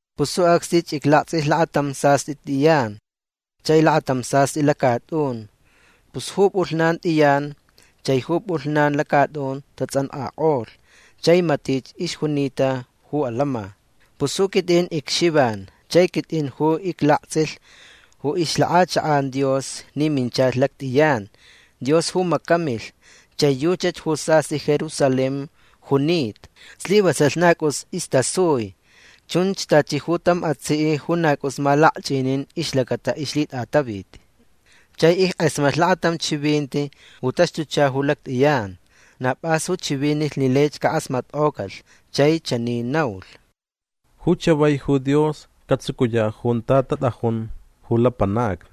Pus ju acsnich iclaktsʼilh lakatam sastʼi tʼiyan chai lakatam sastʼi lacatʼun. Pus ju pʼulhnan tʼiyan chai ju pʼulhnan lacatʼun tatsʼankʼakʼolh chai matich ixjunita ju alama. Pus ju quitʼin icXivan chai quitʼin ju iclaktsʼilh ju ixlakʼachakʼan Dios ni minchalh lactʼiyan. Dios ju macamilh. Chai yuchach ju sastʼi Jerusalén junita. Slivasalh na cʼus istasui. Chun tachi ju tam atsiʼ ju na cʼus malakchʼinin ixlacata ixlhitʼataviti. Chai ickʼasmatlh lakatam chivinti ju taxtucha ju lactʼiyan. Na pʼas ju chivinilh ni laich cakʼasmatkʼocalh. Chai chani naulh: ―Ju chavai ju Dios catsucuyaʼ junta tatʼajun ju lapanacni.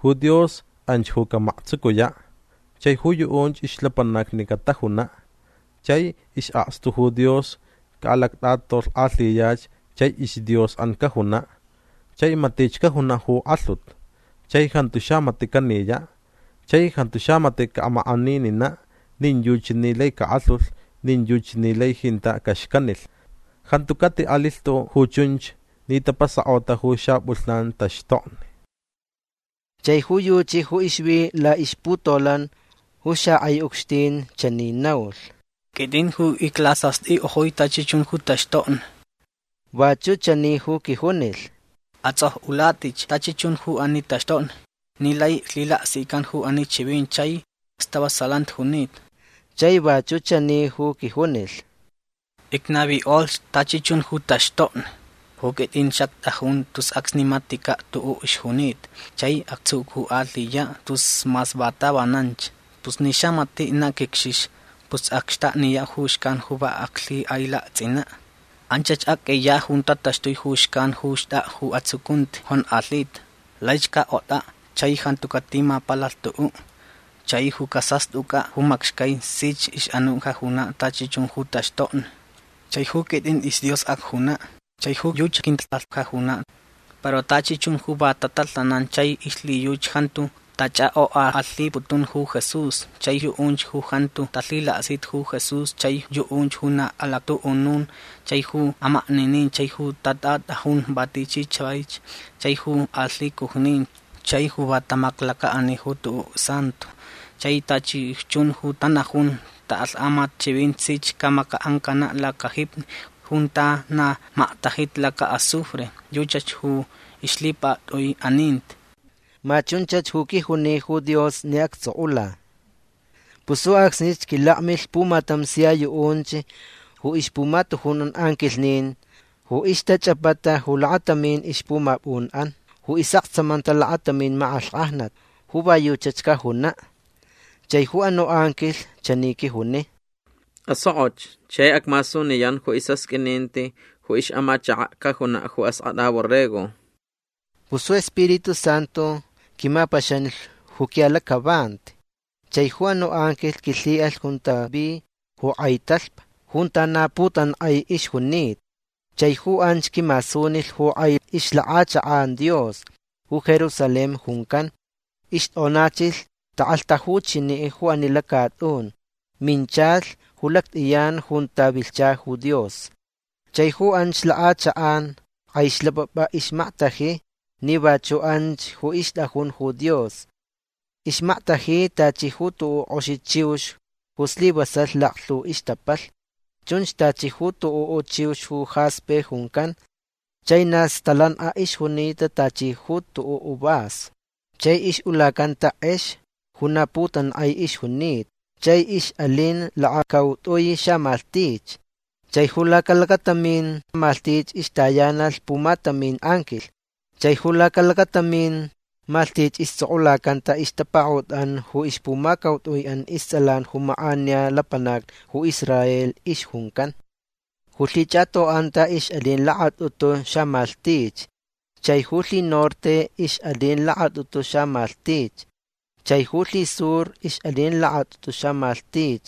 Ju Dios anch ju camaktsucuyaʼ. Chai ju yuʼunch ixlapanacni catajunaʼ. Chai isʼakstu ju Dios caʼalactʼatolhkʼalhiyach chai isDiosʼan cajunaʼ. Chai matich cajunaʼ ju kʼalhut. Chai jantu xamatiʼ caniyaʼ. Chai jantu xamatiʼ caʼamakʼanininaʼ nin yuchi ni lai cakʼalhulh nin yuchi ni lai jintaʼ caxcanilh. Jantu catiʼalilh tuʼuʼ ju chunch ni tapasakʼota ju xapʼulhnan taxtokni. Chai ju yuchi ju ixvi laʼixputolan ju xakʼai ucxtin chani naulh: ―Quitʼin ju iclasastʼikʼojui tachi chun ju taxtokni. Vachuʼ chani ju quijunilh: ―Atsʼokʼulatʼich tachi chun ju ani taxtokni ni lai lhilaksican ju ani chivinti chai stavasalanti junita. Chai vachuʼ chani ju quijunilh: ―Icnavikʼolhch tachi chun ju taxtokni. Ju quitʼin xactʼajun tus acsni maticaʼ tuʼuʼ ixjunita chai actsucukʼalhiyaʼ tus mas va tavananch. Pus ni xamatiʼ na quicxixa pus acxtakniyaʼ ju xcan ju va aclhikʼailaktsʼinaʼ. Anchach acʼiyaʼ junta taxtui ju xcan ju xtʼakʼa ju atsucunti jonkʼalhita. Laich cakʼotʼaʼ chai jantu catimapalalh tuʼuʼ. Chai ju casastʼucʼaʼ ju macxcai sich ixʼanuʼ cajunaʼ tachi chun ju taxtokni. Chai ju quitʼin isDios acjunaʼ. Chai ju yuchi quintsʼalh cajunaʼ. Para tachi chun ju va tatalhanan chai ixlhiyuchi jantu tachʼakʼokʼakʼalhiputun ju Jesús chai yuʼunch ju jantu talhilaksita ju Jesús chai yuʼunch ju na alactuʼunun chai ju amakninin chai ju tatʼatʼajun va tichi chavaich chai ju alhicujnin chai ju va tamaklacaʼani ju tuʼuʼ santo chai tachi chun ju tanajun taʼaklhtamat chivinti sich camacaʼancanaʼ lacajipi junta na maktajita lacaʼazufre. Yuchach ju ixlhipaktʼui aninti. ―Ma chunchach ju quijuni ju Dios ni actsʼokʼula. Pus ju acsnich quilakmilh pumatam sia yuʼunch ju ixpumatujunʼan anquilhnin ju ixtachʼapata ju lakatamin ixpumapʼunʼan ju isʼaktsamanta lakatamin makʼalhkʼajnat ju va yuchach cajunaʼ. Chai ju anuʼ anquilh chani quijuni: ―Asokʼoch chai acmasuniyan ju isʼasqʼuininti ju ixʼamachakaʼ cajunaʼ ju Askʼatʼa Borrego. Pus ju Spiritu Santu quimapaxanilh ju quiʼalacʼavanti chai ju anuʼ anquilh quilhiʼalh junta vi ju kʼai talhpa junta na putankʼai ixjunita. Chai ju anch quimasunilh ju kʼai ixlakʼachakʼan Dios ju Jerusalén juncan. Ixtʼonachilh takʼalhtajuchiniʼ ju ani lacatʼun. Minchalh ju lactʼiyan junta vilhcha ju Dios. Chai ju anch lakʼachakʼan kʼai xlapʼapʼa ixmaktaji ni vachuʼ anch ju ixtʼajun ju Dios. Ixmaktaji tachi ju tuʼuʼ kʼoxi chiux ju slivasalh laklhu ixtapalh. Chun tachi ju tuʼuʼ chiux ju jaspe juncan. Chai na stalankʼa ixjunita tachi ju tuʼuʼ vaso. Chai ixʼulacanta kʼex ju na putankʼai ixjunita. Chai ixʼalin lakacautʼui xamalhtich. Chai ju lacalakatamin malhtich ixtayanalh pumatamin anquilh. Chai ju lacalakatamin malhtich istsʼokʼulacanta ixtapakaʼutʼan ju ixpumacautʼuiʼan istsʼalan ju makʼaniya lapanac ju Israel ixjuncan. Ju lhichʼatoʼanta ixʼalin lakatʼutu xamalhtich. Chai ju lhinorte ixʼalin lakatʼutu xamalhtich. Chai ju lhisur ixʼalin lakatʼutu xamalhtich.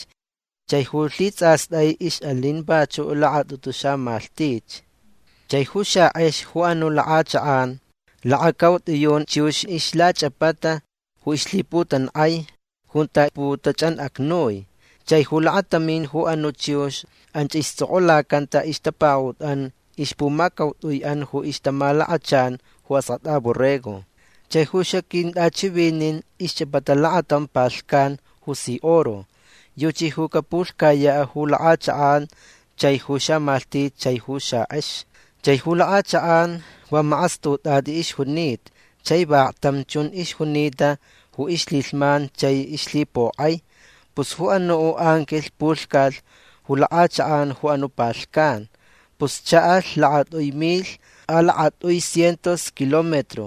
Chai ju lhitsʼastʼai ixʼalin vachuʼ lakatʼutu xamalhtich. Chai ju xakʼex ju anuʼ lakʼachakʼan lakacautʼiyun chiux ixlachʼapata ju ixlhiputankʼai junta putachʼanʼacnui. Chai ju lakatamin ju anuʼ chiux anch istsʼokʼulacanta ixtapakaʼutʼan ixpumacautʼuiʼan ju ixtamalakachan ju Askʼatʼa Borrego. Chai ju xaquintʼachivinin ixchʼapata lakatam palhcan ju si oro. Yuchi ju capulhcayaʼ ju lakʼachakʼan chai ju xamalhtich chai ju xakʼex. Chai ju lakʼachakʼan va makʼastutʼatʼi ixjunita. Chai vaklhtam chun ixjunita ju ixlhilhman chai ixlhipokʼai. Pus ju anuʼ anquilh pulhcalh ju lakʼachakʼan ju anuʼ palhcan. Pus chaʼalh lakatʼui milh a lakatʼui cientos kilómetro.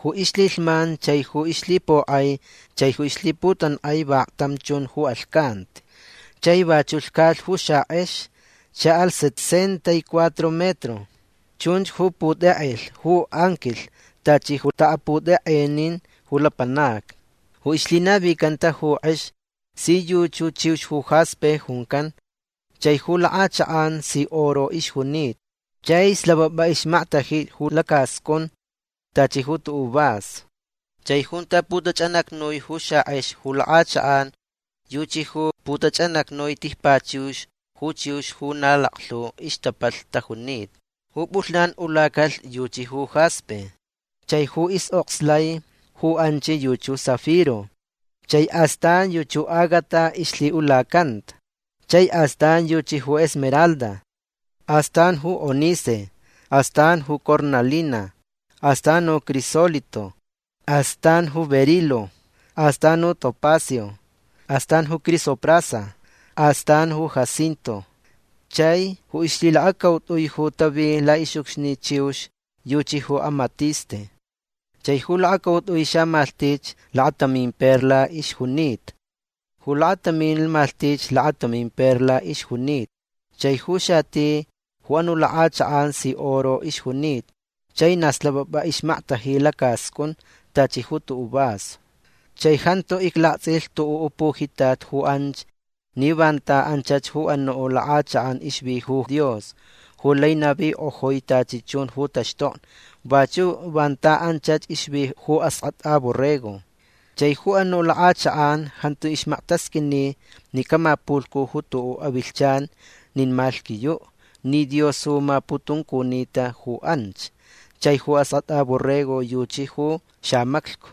Ju ixlhilhman chai ju ixlhipokʼai chai ju ixlhiputankʼai vaklhtam chun ju alhcanti. Chai vachuʼ lhcalh ju xakʼex. Chaʼalh sesenta y cuatro metro. Chunch ju putʼekʼelh ju anquilh tachi ju taʼaputʼekʼenin ju lapanacni. Ju ixlhinavicanta ju kʼex si yuʼ ju chiux ju jaspe juncan. Chai ju lakʼachakʼan si oro ixjunita. Chai slapʼapʼa ixmaktaji ju lacascʼun tachi ju tuʼuʼ vaso. Chai junta putachʼanʼacnui ju xakʼex ju lakʼachakʼan yuchi ju putachʼanʼacnui tijpachux ju chiux ju na laklhu ixtapalh tajunita. Ju pʼulhnan ulacalh yuchi ju jaspe. Chai ju ixʼokslai ju anch yuchi ju zafiro. Chai astan yuchi ju ágata ixlhiʼulacanta. Chai astan yuchi ju esmeralda. Astan ju ónice. Astan ju cornalina. Astan ju crisólito. Astan ju berilo. Astan ju topacio. Astan ju crisoprasa. Astan ju jacinto. Chai ju ixlhilakacautʼui ju tavi laʼixʼucxni chux yuchi ju amatiste. Chai ju lakacautʼui xamalhtich lakatamin perla ixjunita. Ju lakatamin malhtich lakatamin perla ixjunita. Chai ju xati ju anuʼ lakʼachakʼan si oro ixjunita. Chai na slapʼapʼa ixmaktaji lacascʼun tachi ju tuʼuʼ vaso. Chai jantu iclaktsʼilh tuʼuʼ pujitat ju anch ni vanta anchach ju anuʼ lakʼachakʼan ixvi ju Dios ju lai navikʼojui tachi chun ju taxtokni. Vachuʼ vanta anchach ixvi ju Askʼatʼa Borrego. Chai ju anuʼ lakʼachakʼan jantu ixmaktasqʼuini ni camapulhcu ju tuʼuʼ avilhchan nin malhquiyuʼ ni Dios ju maputuncunita ju anch. Chai ju Askʼatʼa Borrego yuchi ju xamaclhcu.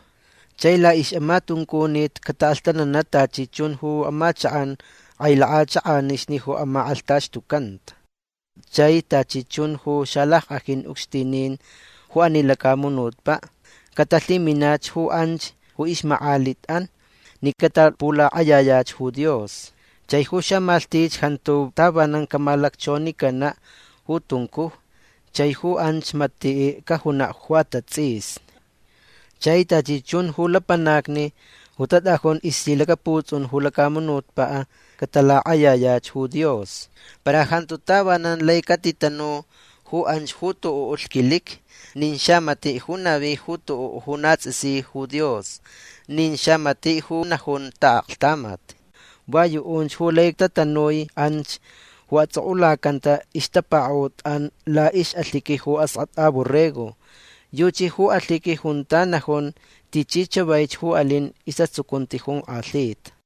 Chai laʼixʼamatuncunit cataʼalhtananaʼ tachi chun ju amachakʼan kʼai lakʼachakʼanixni ju amakʼalhtaxtucanta. Chai tachi chun ju xalackʼajin ucxtinin ju ani lacamunutpaʼ catalhiminach ju anch ju ixmakʼalitʼan ni catapulakʼayayach ju Dios. Chai ju xamalhtich jantu tavanan camalacchonicanaʼ ju tuncuj. Chai ju anch matiʼ cajunaʼ ju atatsʼisni. Chai tachi chun ju lapanacni ju tatʼajun ixlhilacaputsʼun ju lacamunutpaʼ catalakʼayayach ju Dios. Para jantu tavanan lai catitanu ju anch ju tuʼuʼ lhquiliqui nin xamatiʼ ju navi ju tuʼuʼ ju na tsʼisi ju Dios nin xamatiʼ ju najun taʼaklhtamat. Va yuʼunch ju lai tatanui anch ju atsʼokʼulacanta ixtapakaʼutʼan laʼixʼalhiqui ju Askʼatʼa Borrego. Yuchi ju alhiqui junta najun tichi chavaich ju alin isʼatsucunti jonkʼalhita.